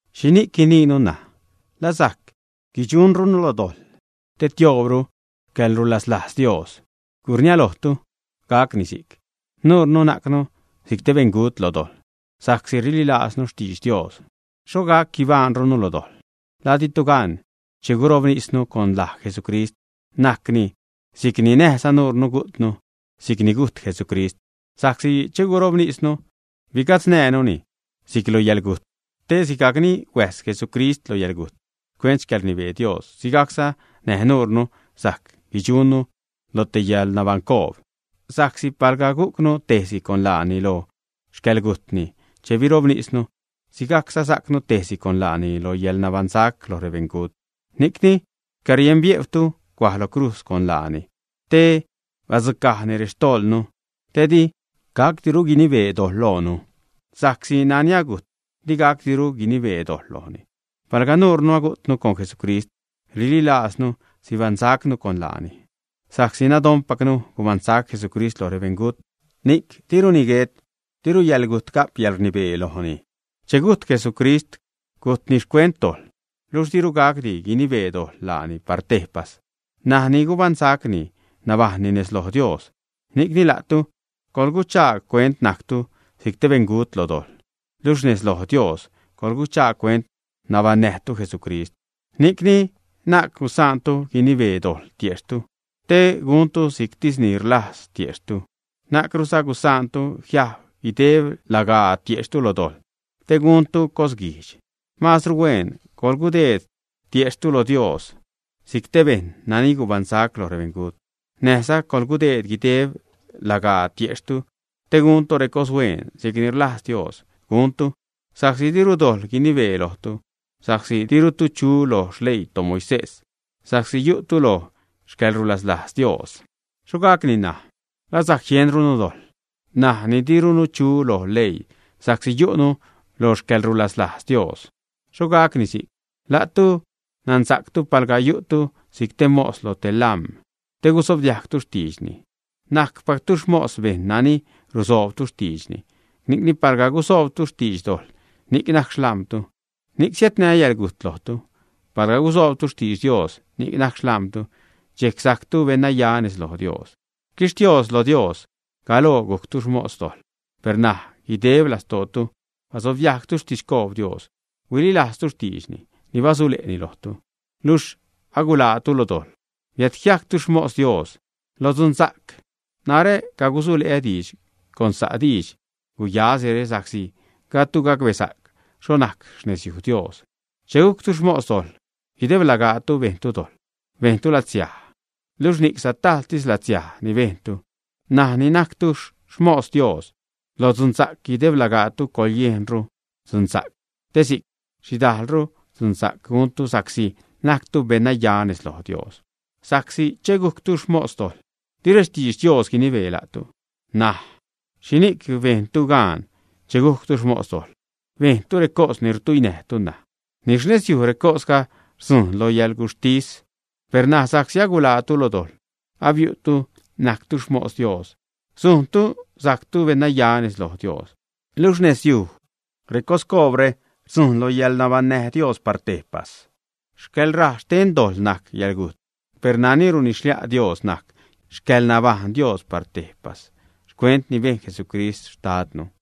¿Xhini'c guiniinu, ṉaj? ¿La sajc guidxunrunu lo dojḻ te tioobru xcäḻrulaslajz Dios, ä? ¡Gurniälojtu gacni si'c! Nuurnu najcnu si'c te beṉgut lo dojḻ sa'csi rililajznu xtidx Dios; ¿xhoxh gac guibajṉrunu lo dojḻ? ¿La ditu gan, che gurobnisnu con laj Jesucrist, najcni si'c ni näjza nuurnu gujtnu si'c ni gujt Jesucrist? Sa'csi che gurobnisnu bigatznäjnuni si'c lo yäḻgujt, te sigajcni huäjs Jesucrist lo yäḻgujt xcuent xcäḻrnibee Dios, sigajcza näj nuurnu sajc guidxunnu lo te yäḻnabaṉcoob. Sa'csi palga gujcnu tejsi con laani lo xcäḻgujtni che birobnisnu, sigajcza sajcnu tejsi con laani lo yäḻnabaṉsac lo rebeṉgut. Ni'cni xcärienbiejwnu cuaj lo crujz con laani, te badzucajni rextojḻnu, te di gacdiru guinibee dojḻ loonu. Sa'csi nani agujt, di gacdiru guinibee dojḻ lojni. Palga nuurnu agujtnu con Jesucrist, rililaaznu sibaṉsaczanu con laani. Sa'csi nadonpacnu gubaṉsac Jesucrist loj rebeṉgut, ni'c diruni guet, diru yäḻgujt ga'p yäḻrnibee lojni. Che gujt Jesucrist, gujtni xcuent dojḻ, luxh diru gacdi guinibee dojḻ laani par tejpas; ṉaj ni gubaṉsacni, nabajṉni nez loj Dios. Ni'cni la'tu coḻguchaag cuent najctu si'c te beṉgut lo dojḻ, luxh nez loj Dios, coḻguchaag cuent nabaṉnäjtu Jesucrist. Ni'cni na'c gusaantu guinibee dojḻ tiejxhtu te guntu si'ctis ni rlajz tiejxhtu. Na'cruza gusaantu jiajb guideb lagaa tiejxhtu lo dojḻ te guntu cosguijdx. Maazru hueen coḻgudeed tiejxhtu lo Dios si'c te bejṉ nani gubaṉsac lo rebeṉgut, näjza coḻgudeed guideb lagaa tiejxhtu te guntu recoshueen si'c ni rlajz Dios guntu. Sa'csi diru dojḻ guinibee lojtu, sa'csi dirutu chu loj xleii toMoisés, sa'csi yu'tu lo xcäḻrulaslajz Dios. ¿Xho gacni ṉaj? ¿La sajc jienrunu dojḻ ṉaj ni dirunu chu lo leii sa'csi yu'nu lo xcäḻrulaslajz Dios, ä? ¡Xho gacni si'c! La'tu nansa'ctu palga yu'tu si'c te mos loj te lam̲ te gusobdiajgtu xtiidxni, najcpactu xmos bejṉ nani rusoobtu xtiidxni. Ni'cni, palga gusoobtu xtidx dojḻ, ni'c najc xlam̲tu, ni'c siädnä yäḻgujt lojtu. Palga gusoobtu xtidx Dios, ni'c najc xlam̲tu. Dxejc sajctu beṉnaya nez loj Dios. Xquixtios lo Dios, galoo gujctu xmos dojḻ, per ṉaj guideb lastootu basobdiajgtu xtidxcoob Dios, huililajztu xtiidxni ni basule'nu lojtu. Luxh aguḻaatu lo dojḻ, biädjiajctu xmos Dios lo dzunsa'c. Narä cagusule'ä diidx con sa' didx guyasire sa'csi gajdtu gacbesa'c xho najc xnezyuj Dios. Che gujctu xmos dojḻ, guideb lagaatu bejntu dojḻ, bejntu latsiaj, luxh ni'c satajltis latsiaj ni bejntu. N̲aj ni najctu xmos Dios lo dzunsa'c, guideb lagaatu coḻyejnru dzunsa'c, te si'c sidajlru dzunsa'c ni guntu sa'csi najctu beṉnaya nez loj Dios. Sa'csi che gujctu xmos dojḻ, di rextidx Dios guinibee la'tu. N̲aja', ¿xhini'c bejntu gaan che gujctu xmos dojḻ, bejntu recos ni rtuinäjtu ṉaj? Ni xnezyuj recosga rdzujṉ loj yäḻgujttis. Per ṉaj, sa'csi aguḻaatu lo dojḻ, abiu'tu najctu xmos Dios, sujntu sajctu beṉnaya nez loj Dios, luxh xnezyuj recoscoobre rdzujṉ lo yäḻnabaṉnäj Dios par tejpas. Xcäḻrajx xten dojḻ najc yäḻgujt, per nani runidx-xlia' Dios najc xcäḻnabaṉnäj Dios par tejpas xcuent ni bejn Jesucrist xtadnu.